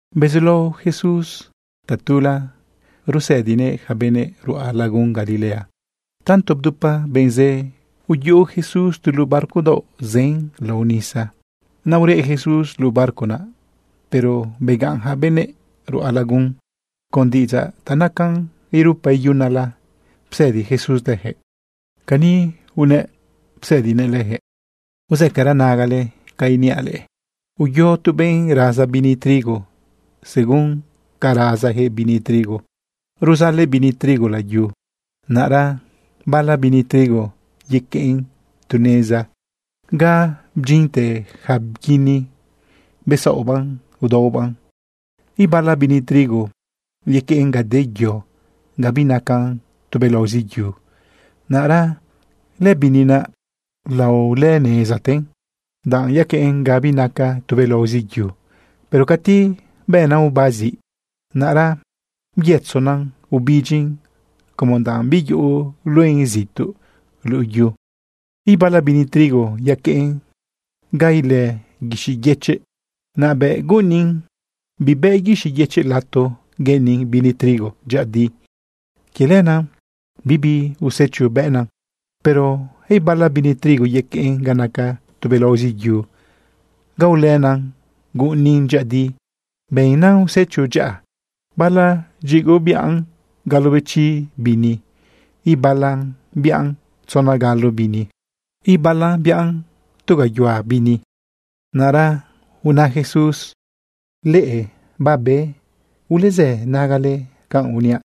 Bezulao Jesús tatula usëdinëꞌ yaca benëꞌ ruꞌa lagun Galilea. Tanto bdupa benꞌ zë, uyuꞌu Jesús tu luꞌu barco daoꞌ zën lao nisa. Naꞌ ureꞌ Jesús luꞌu barco naꞌ, pero begaꞌn yaca benëꞌ ruꞌa lagun. Con diꞌidzaꞌ ta nacan irupa iyunala psëdi Jesús leyaquëꞌ. Cani unëꞌ psëdinëꞌ leyaquëꞌ: ―Uzëcara nagale ca niaꞌ leꞌe. Uyo tu benꞌ raza bini trigo. Según ca razayaquëꞌ bini trigo, ruzalëꞌ bini trigo layu. Naꞌra bala bini trigo yaqueꞌn tu neza ga bdyinte yaca bguini besaꞌobaꞌn udaobaꞌn. Ibala bini trigo yaqueꞌn ga de yo, ga binacan tubelaozi yu. Naꞌra lëbini naꞌ laolënezaten danꞌ yaqueꞌn ga binacan tubelaozi yu. Pero cati bena oba ziꞌ, naꞌra byëtzona ubidyin como danꞌ biuyuꞌu luena zituꞌ luꞌu yu. Ibala bini trigo yaqueꞌn ga ilë guixiꞌ yëchiꞌ. Naꞌ bëꞌ guꞌunin, bibë guixiꞌ yëchiꞌ lato gueꞌeni bini trigo dyëꞌëdi. Quie lenaꞌ bibi usecho bëꞌnan. Pero ibala bini trigo yaqueꞌn ga naca tubelaozi yu ga ulëna guꞌunin dyëꞌëdi bëꞌnan usecho dyaꞌa. Bala dyigoꞌ biꞌan galobechi bini, ibalan biꞌan tzona galo bini, ibalan biꞌan tu gayuhua bini. Naꞌra una Jesús: ―Leꞌe babe ulezë nagale canꞌ uniaꞌ.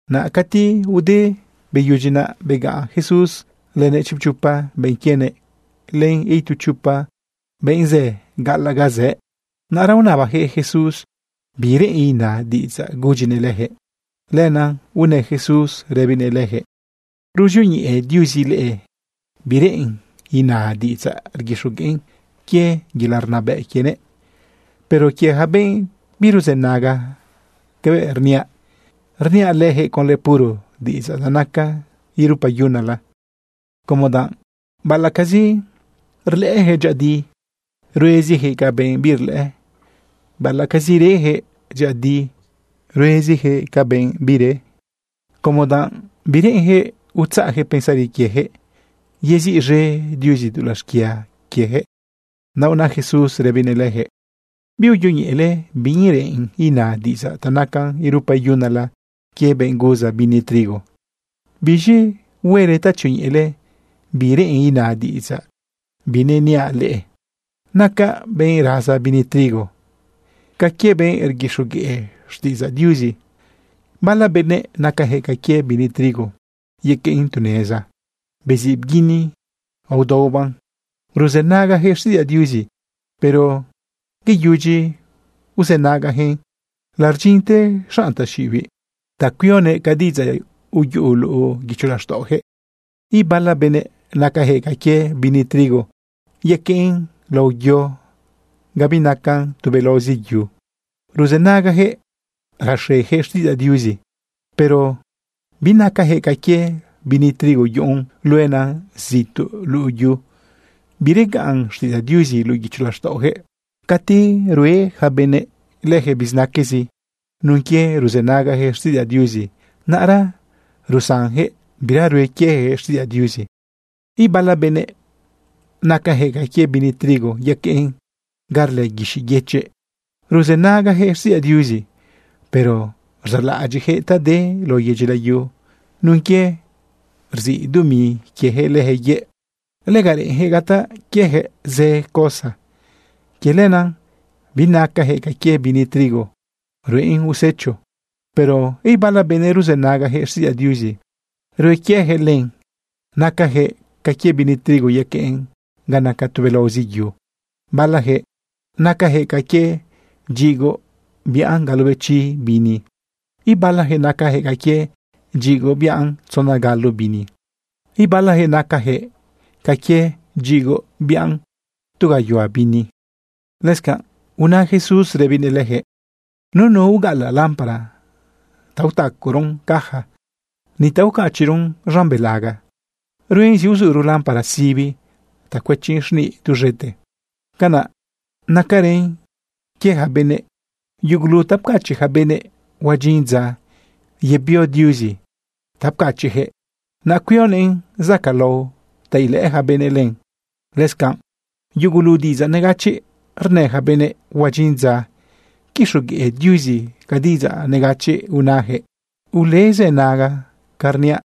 Naꞌ cati ude beyudyi naꞌ, begaꞌn Jesús lënëꞌ chipchopa benꞌ quienëꞌ len itu chopa benꞌ zë gaꞌalaꞌ ga zëꞌ. Naꞌra unabayaquëꞌ Jesús bi reꞌen ina diꞌidzaꞌ gudyinëꞌ leyaquëꞌ. Lenaꞌ unë Jesús rëbinëꞌ leyaquëꞌ: ―Ruzioñeꞌe Diuzi leꞌe bi reꞌen ina diꞌidzaꞌ rguixogueꞌn quie yelaꞌ rnabëꞌ quienëꞌ. Pero quie yaca benꞌ biruzënaga cabëꞌ rniaꞌ, rniaꞌ leyaquëꞌ conlë puro diꞌidzaꞌ ta naca irupa iyunala como danꞌ baꞌalaꞌcazi rlëꞌëyaquëꞌ dyëꞌëdi, rueziyaquëꞌ ca benꞌ birlëꞌë, baꞌalaꞌcazi reyaquëꞌ dyëꞌëdi, rueziyaquëꞌ ca benꞌ bire, como danꞌ bireꞌenyaquëꞌ utzaꞌyaquëꞌ pensari quieyaquëꞌ yeziꞌz̃e Diuzi dulaꞌ xquia quieyaquëꞌ. Naꞌ una Jesús rëbinëꞌ leyaquëꞌ: ―¿Biuyoñeꞌele bi reꞌen ina diꞌidzaꞌ ta nacan irupa iyunala quie benꞌ guza bini trigo? ¿Biz̃i huele ta tzioñeꞌele bi reꞌen ina diꞌidzaꞌ bineniaꞌ leꞌe? Naca benꞌ raza bini trigo ca quie benꞌ rguixogueꞌ xtiꞌidzaꞌ Diuzi. Bala benëꞌ nacayaquëꞌ ca quie bini trigo yaqueꞌn tu neza beziꞌ bguini aodaobaꞌn. Ruzënagayaquëꞌ xtiꞌidzaꞌ Diuzi, pero beyudyi bzënagayaquëꞌn, lardyinte xanꞌ taxiꞌibiꞌ ta cuionëꞌ ca diꞌidzaꞌ uyuꞌu luꞌu guicho laxtaꞌoyaquëꞌ. Ibala benëꞌ nacayaquëꞌ ca quie bini trigo yaqueꞌn lao yo ga binacan tubelaozi yu. Ruzënagayaquëꞌ raxeyaquëꞌ xtiꞌidzaꞌ Diuzi. Pero binacayaquëꞌ ca quie bini trigo yuꞌun luena zituꞌ luꞌu yu. Biregaꞌn xtiꞌidzaꞌ Diuzi luꞌu guicho laxtaꞌoyaquëꞌ. Cati rue yaca benëꞌ leyaquëꞌ bizinaquezi nun quie ruzënagajëꞌ xtiꞌidzaꞌ Diuzi, naꞌra rusanyaquëꞌ bira rue quieyaquëꞌ xtiꞌidzaꞌ Diuzi. Ibala benëꞌ nacayaquëꞌ ca quie bini trigo yaqueꞌn ga rlë guixiꞌ yëchiꞌ. Ruzënagayaquëꞌ xtiꞌidzaꞌ Diuzi. Pero rzaꞌlaꞌadyiꞌyaquëꞌ ta de lao yedyi layu. Nun quie rziꞌ dumi quieyaquëꞌ leyaquëꞌ yëꞌ, lega reꞌenyaquëꞌ gataꞌ quieyaquëꞌ zë cosa. Quie lenaꞌ binacayaquëꞌ ca quie bini trigo ruꞌen usecho. Pero ibala benëꞌ ruzënagayaquëꞌ xtiꞌidzaꞌ Diuzi, rue quieyaquëꞌ len. Nacayaquëꞌ ca quie bini trigo yaqueꞌn ga naca tubelaozi yu. Balayaquëꞌ nacayaquëꞌ ca quie dyigoꞌ biꞌan galobechi bini, ibalayaquëꞌ nacayaquëꞌ ca quie dyigoꞌ biꞌan tzona galo bini, ibalayaquëꞌ nacayaquëꞌ ca quie dyigoꞌ biꞌan tu gayuhua bini. Lëscanꞌ una Jesús rëbinëꞌ leyaquëꞌ: ―Nunu ugaꞌalaꞌ lámpara ta utacaron caja, ni ta ucachiꞌron z̃an belaga. Ruen zi uzuro lámpara sibi ta cuëchin z̃niꞌ duz̃ete. Canaꞌ nacarën quie yaca benëꞌ. Yugulu ta pcachiꞌ yaca benëꞌ, huadyin dza yebio Diuzi ta pcachiꞌyaquëꞌ, naꞌ cuionëꞌn zacaꞌlao ta ilëꞌë ja benëꞌ len. Lëscanꞌ yugulu diꞌidzaꞌ negachiꞌ rnë yaca benëꞌ, huadyin dza quixogueꞌ Diuzi ca diꞌidzaꞌ negachiꞌ unayaquëꞌ. Ulezënaga ca rniaꞌ.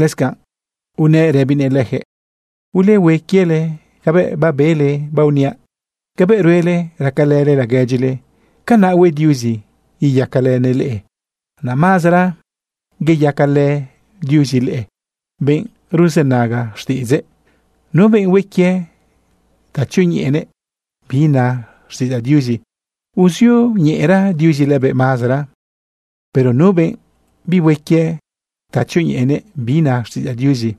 Lëscanꞌ unëꞌ rëbinëꞌ leyaquëꞌ: ―Ulehue quiele cabëꞌ babele baoniaꞌ. Cabëꞌ ruele racalële laguedyile, canaꞌ hue Diuzi iyacalënëꞌ leꞌe. Naꞌ mazara iyacalë Diuzi leꞌe, benꞌ ruzënaga xtiꞌidzëꞌ. Nu benꞌ hue quie ta tzioñeꞌenëꞌ bi na xtiꞌidzaꞌ Diuzi, uzioñeꞌera Diuzi lëbëꞌ mazara. Pero nu benꞌ bihue quie ta tzioñeꞌenëꞌ bi na xtiꞌidzaꞌ Diuzi,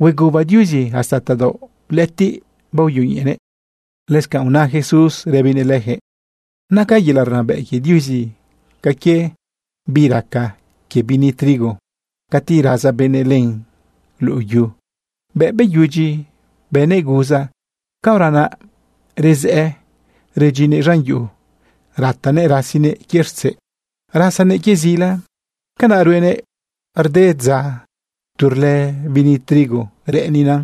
hueguba Diuzi hasta tadaoꞌ lëꞌëtiꞌ baoyoñeꞌenëꞌ. Lëscanꞌ una Jesús rëbinëꞌ leyaquëꞌ: ―Naca yelaꞌ rnabëꞌ quie Diuzi ca quie bi raca quie bini trigo cati raza benëꞌ len luꞌu yu. Bëꞌ beyudyi bënëꞌ guza, caora naꞌ rezëꞌë redyinnëꞌ z̃an yuꞌu ratanëꞌ rasinëꞌ quie rtzeꞌ, rasanëꞌ quie zila. Canaꞌ ruenëꞌ rde dza tu rlë bini trigo reꞌenina,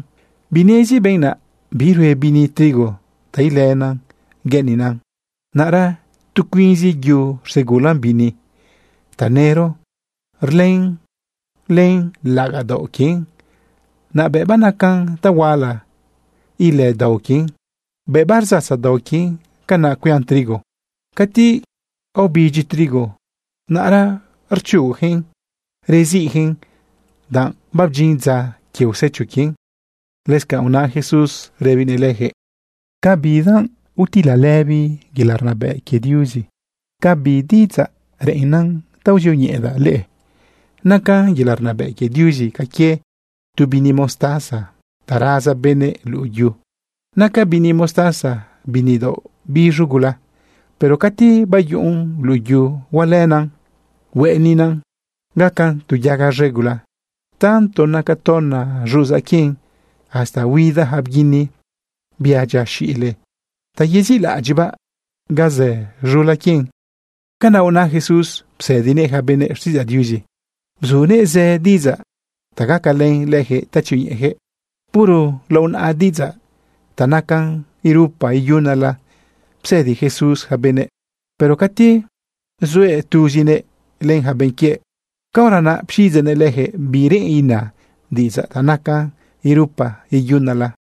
binezi benꞌ naꞌ birue bini trigo ta ilëna gueꞌenina. Naꞌra tu cuinzi yu rsegulan bini. Tanëro rlën len laꞌagaꞌ daoꞌ quien. Naꞌ bëꞌ banacan tahuala, ilë dao quien. Bëꞌ bardzatza dao quien, canaꞌ cuian trigo. Cati aobidyi trigo, naꞌra rchugujëꞌn reziꞌjëꞌn, danꞌ babdyin dza quie usecho quien. Lëscanꞌ una Jesús rëbinëꞌ leyaquëꞌ: ―¿Con bidanꞌ utilalëbi yelaꞌ rnabëꞌ quie Diuzi? ¿Con bi diꞌidzaꞌ reꞌennan ta uzioñeꞌedaꞌ leꞌe? Naca yelaꞌ rnabëꞌ quie Diuzi ca quie tu bini mostaza ta raza benëꞌ luꞌu yu. Naca bini mostaza bini daoꞌ biz̃u gula. Pero cati bayuꞌun luꞌu yu, hualëna hueꞌenina gacan tu yaga z̃e gula. Tanto naca tona xuꞌuzan quien, hasta huida yaca bguini, bia dyia xile, ta yezilaꞌadyiꞌbaꞌ ga zë z̃ula quien. Canaꞌ una Jesús psëdinëꞌ yaca benëꞌ xtiꞌidzaꞌ Diuzi. Bzunëꞌ zë diꞌidzaꞌ ta gacalën leyaquëꞌ ta tzioñeꞌeyaquëꞌ. Puro lao naꞌa diꞌidzaꞌ ta nacan irupa iyunala psëdi Jesús yaca benëꞌ, pero cati zuëꞌ tuzinëꞌ len yaca benꞌ quiëꞌ, caora naꞌ pxiꞌidzeꞌnëꞌ leyaquëꞌ bi reꞌen ina diꞌidzaꞌ ta nacan irupa iyunala.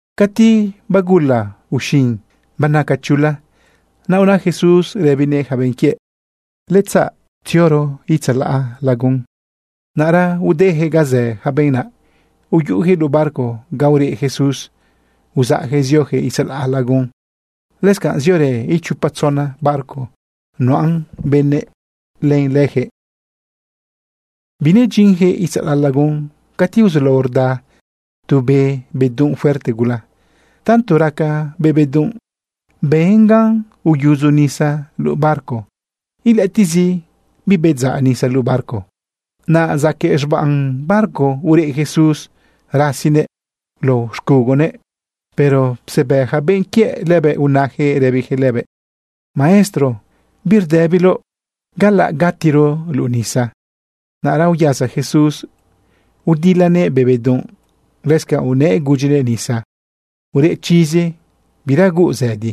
Cati bagula uxin banaca chula, naꞌ una Jesús rëbinëꞌ yaca benꞌ quiëꞌ: ―Yaꞌ tzioro itzalaꞌ lagun. Naꞌra udeyaquëꞌ ga zë yaca benꞌ naꞌ, uyuꞌuyaquëꞌ luꞌu barco ga ureꞌ Jesús uzaꞌyaquëꞌ zioyaquëꞌ itzalaꞌ lagun. Lëscanꞌ ziorë ichopa tzona barco nuꞌan benëꞌ len leyaquëꞌ. Binedyinyaquëꞌ itzalaꞌ lagun cati uzulao rda tu be bedunꞌ fuerte gula. Tanto raca be bedunꞌ, ben gan uyudzo nisa luꞌu barco, ilëꞌëtiꞌzi bibedzaꞌ nisa luꞌu barco. Naꞌ zaquëꞌ z̃bam barco ureꞌ Jesús rasinëꞌ lao xcugonëꞌ. Pero psebë yaca benꞌ quiëꞌ lëbëꞌ, unayaquëꞌ rëbiyaquëꞌ lëbëꞌ: ―¡Maestro! ¿Birdëbiloꞌ galaꞌ gatiro luꞌu nisa? Naꞌra uyasa Jesús udilanëꞌ be bedunꞌ. Lëscanꞌ unëꞌ gudyinëꞌ nisa: ―¡Ureꞌ chizi! ¡Bira huuꞌ zëdi!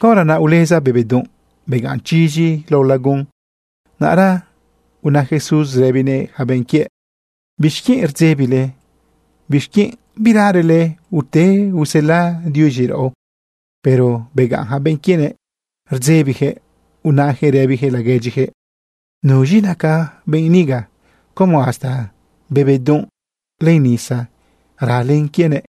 Caora naꞌ uleza be bedunꞌ, begaꞌn chizi lao lagun. Naꞌra una Jesús rëbinëꞌ yaca benꞌ quiëꞌ: ―¿Bixquienꞌ rdzebile? ¿Bixquienꞌ biralele ute usela Diuzi raꞌo? Pero begaꞌn yaca benꞌ quienëꞌ rdzebiyaquëꞌ unayaquëꞌ rëbiyaquëꞌ laguedyiyaquëꞌ: ―¿Nuz̃i naca benꞌ niga como hasta be bedunꞌ len nisa ralen quienëꞌ?